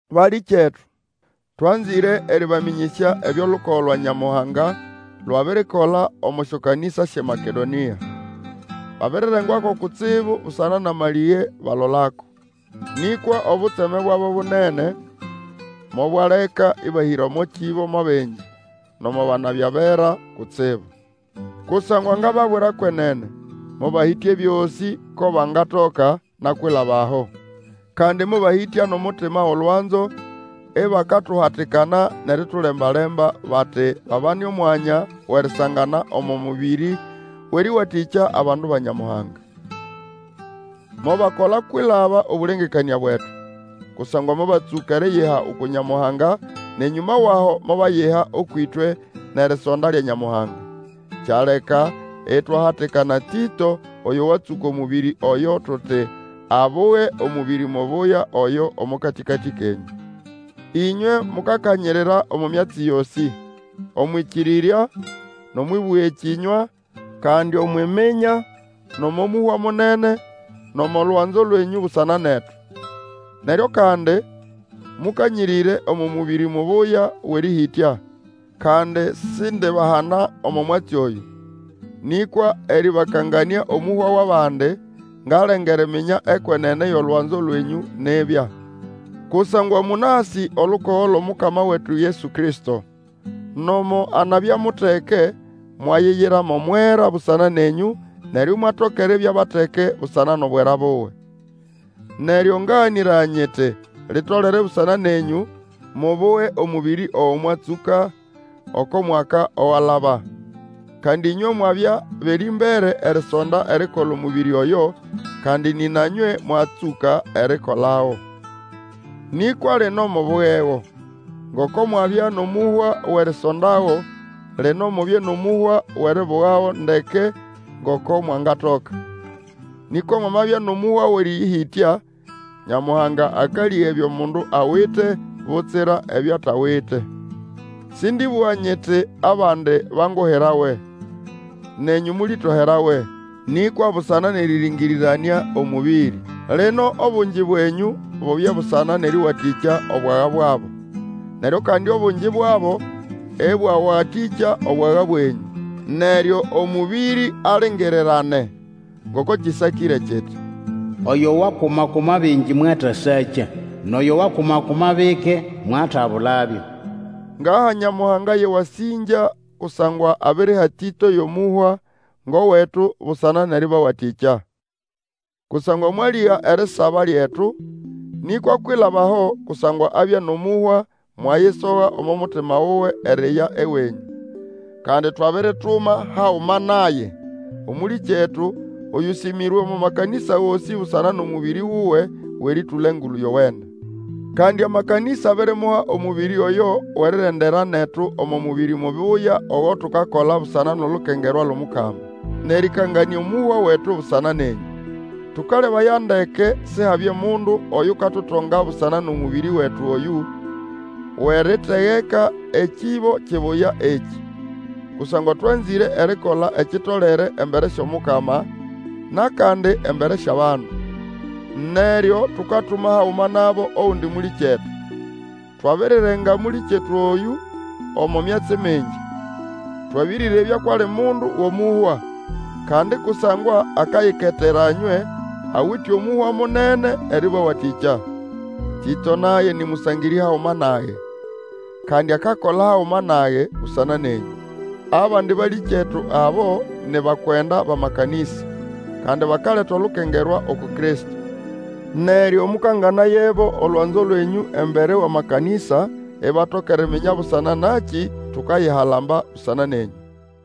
Balĩkyetu, twanzĩre erĩbamĩnyĩsya ebyo ĩlukogo lwa Nyamuhanga lwabirikola omo syokanĩsa syʼeMakedonĩa. Babirirengwako kutsibu busana nʼamalĩge balolako. Nĩkwa obutseme bwabo bunene mobwaleka ĩbahĩra omo kĩbo mo bingi, nomo banabya bera kutsibu. Kusangwa ngababwira kwenene, mobahĩtya ebyosĩ ko bangatoka, na kwilaba aho. Kandi mobahĩtya nʼomutima wʼolwanzo, ibakatuhatikana nʼeritulembalemba, bati babane omwanya wʼerisangana omo mũbĩrĩ wʼerĩwatĩkya abandu ba Nyamuhanga. Mobakola kwilaba obũlengekanĩa bwetu, kusangwa mobatsũka eriyiha uku Nyamuhanga, nʼenyũma wʼaho mobayiha ũkwʼĩtwe nʼerisonda lya Nyamuhanga. Kyaleka itwahatikana Tĩto, oyo watsũka omũbĩrĩ oyo, tuti, abuge omũbĩrĩ mubuya oyo omo katĩkatĩ kenyũ. Ĩnywe mukakanyirira omo myatsi yosĩ, omwʼĩkĩrĩrya, nʼomwʼĩbũga ekĩnywa, kandi Omwʼiminya, nʼomo mũhwa munene, nʼomo lwanzo lwenyũ busana netu. Neryo kandi mukanyirire omo mũbĩrĩ mubuya wʼerĩhĩtya. Kandi sindibahana omo mwatsi oyũ, nĩkwa erĩbakanganĩa omũhwa wʼabandi, ngalenga eriminya ekwenene yʼolwanzo lwenyũ nibya. Kusangwa mũnasĩ olukogo lwʼOmukama wetu Yesu Kristo. Nomo anabya muteke, mwayiyira mo mwera busana nenyũ, neryo imwatoka eribya bateke busana nʼobwera buwe. Neryo ngaganĩraya nyiti, litolere busana nenyũ, mubuge omũbĩri ogo mwatsũka oko mwaka owalaba. Kandi ĩnywe mwabya bʼerĩmbere erisonda erikola omũbĩrĩ oyo, kandi nĩna nywe mwatsũka erikolago. Nĩkwa lino mubugego; ngoko mwabya nʼomũhwa wʼerisondago, lino mubye nʼomũhwa wʼeribugago ndeke ngoko mwangatoka. Nĩkwa mwamabya nʼomũhwa wʼerĩhĩtya, Nyamuhanga akalĩga ebyo mundu awite, butsira ebyo atawite. Sĩndĩbũga nyiti, abandi banguhirawe, nenyũ mũlĩtoherawe, nĩkwa busana nʼerĩrĩngĩrĩranĩa omũbĩrĩ. Lino obungi bwenyũ bubye busana nʼerĩwatĩkya obwaga bwabo, neryo kandi obungi bwabo ĩbwawatĩkya obwaga bwenyũ, neryo omũbĩrĩ alingirirane. Ngoko kĩsakĩre kiti, Oyo wakuma-kuma bingi mwatasakya, Nʼoyo wakuma-kuma bike mwatabulabyo. Ngaha Nyamuhanga yʼewasĩngya kusangwa abiriha Tĩto yʼomũhwa ngʼowetu busana nʼerĩbawatĩkya. Kusangwa mwalĩga erisaba lyetu, nĩkwa kwilaba aho kusangwa abya nʼomũhwa, mwayisoga omo mutima wuwe eriya ewenyũ. Kandi twabirituma haguma naye, Omũlĩkyetu, oyũsĩmĩrwe omo makanĩsa gosĩ busana nʼomũbĩrĩ wuwe wʼerĩtũla Engulu Yowene. Kandi amakanĩsa abirimuha omũbĩrĩ oyo wʼerirendera netu omo mũbĩrĩ mubuya ogo tukakola busana nʼolukengerwa lwʼOmukama, nʼerĩkanganĩa omũhwa wetu busana nenyũ. Tũkalebaya ndeke Sihabye mundu oyukatutonga busana nʼomũbĩrĩ wetu oyũ, wʼeritegeka ekĩbo kibuya ekĩ. Kusangwa twanzĩre erikola ekitolere embere syʼOmukama, nʼakandi embere syʼabandu. Neryo tukatuma haguma nabo ogundi mũlĩkyetu. Twabirirenga mũlĩkyetu oyũ omo myatsi mingi, twabĩrĩrebya kwʼali mundu wʼomũhwa, kandi kusangwa akayiketera nywe, awite omũhwa munene erĩbawatĩkya. Tĩto naye, nĩ mũsangĩrĩ haguma nage, kandi akakola haguma nage busana nenyũ. Abandi balĩkyetu abo ni bakwenda bʼamakanĩsa, kandi bakaleta olukengerwa uku Kristo. Neryo mũkanganayebo olwanzo lwenyũ embere wʼamakanĩsa, ibatoka eriminya busana nakĩ tukayihalamba busana nenyũ.